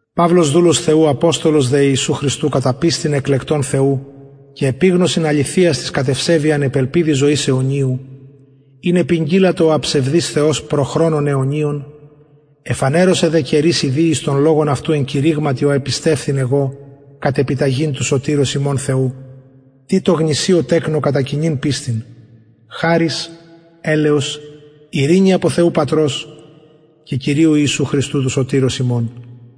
παυλος δουλος θεου αποστολος δε ιησου χριστου κατα πιστιν εκλεκτων θεου και επιγνωσιν αληθειας της κατ ευσεβειαν επ ελπιδι ζωης αιωνιου ην επηγγειλατο ο αψευδης θεος προ χρονων αιωνιων εφανερωσεν δε καιροις ιδιοις τον λογον αυτου εν κηρυγματι ο επιστευθην εγω κατ επιταγην του σωτηρος ημων θεου τιτω γνησιω τεκνω κατα κοινην πιστιν χαρις ελεος ειρηνη απο θεου πατρος και κυριου ιησου χριστου του σωτηρος ημων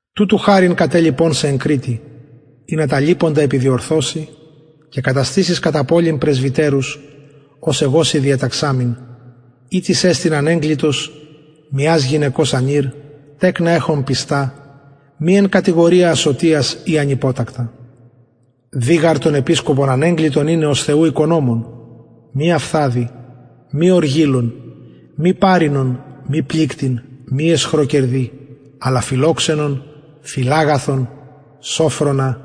τουτου χαριν κατελιπον σε εν κρητη ινα τα λειποντα επιδιορθωση και καταστησης κατα πολιν πρεσβυτερους ως εγω σοι διεταξαμην ει τις εστιν ανεγκλητος μιας γυναικος ανηρ τεκνα εχων πιστα μη εν κατηγορια ασωτιας η ανυποτακτα δει γαρ τον επισκοπον ανεγκλητον ειναι ως θεου οικονομον μη αυθαδη μη οργιλον μη παροινον μη πληκτην μη αισχροκερδη αλλα φιλοξενον φιλαγαθον σωφρονα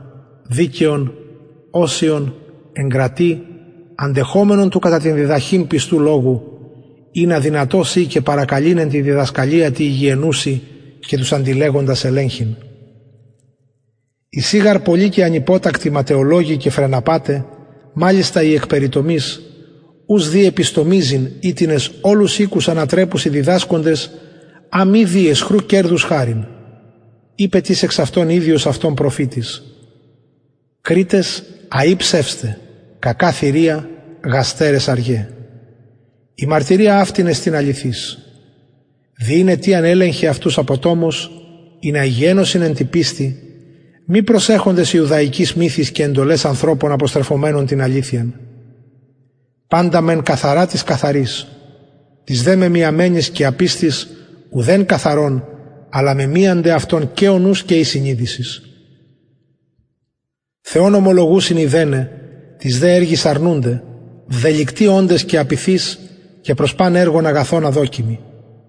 δικαιον οσιον εγκρατη αντεχομενον του κατα την διδαχην πιστου λογου ινα δυνατος η και παρακαλειν εν τη διδασκαλια τη υγιαινουση και τους αντιλεγοντας ελεγχειν εισιν γαρ πολλοι και ανυποτακτοι ματαιολογοι και φρεναπαται μαλιστα οι εκ περιτομης ους δει επιστομιζειν οιτινες ολους οικους ανατρεπουσιν διδασκοντες α μη δει αισχρου κερδους χαριν ειπεν τις εξ αυτων ιδιος αυτων προφητης κρητες αει ψευσται κακα θηρια γαστερες αργαι η μαρτυρια αυτη εστιν αληθης δι ην αιτιαν ελεγχε αυτους αποτομως ινα υγιαινωσιν εν τη πιστει μη προσεχοντες ιουδαικοις μυθοις και εντολαις ανθρωπων αποστρεφομενων την αληθειαν παντα μεν καθαρα τοις καθαροις τοις δε μεμιασμενοις και απιστοις ουδεν καθαρον αλλα μεμιανται αυτων και ο νους και η συνειδησις θεον ομολογουσιν ειδεναι τοις δε εργοις αρνουνται βδελυκτοι οντες και απειθεις και προς παν εργον αγαθον αδοκιμοι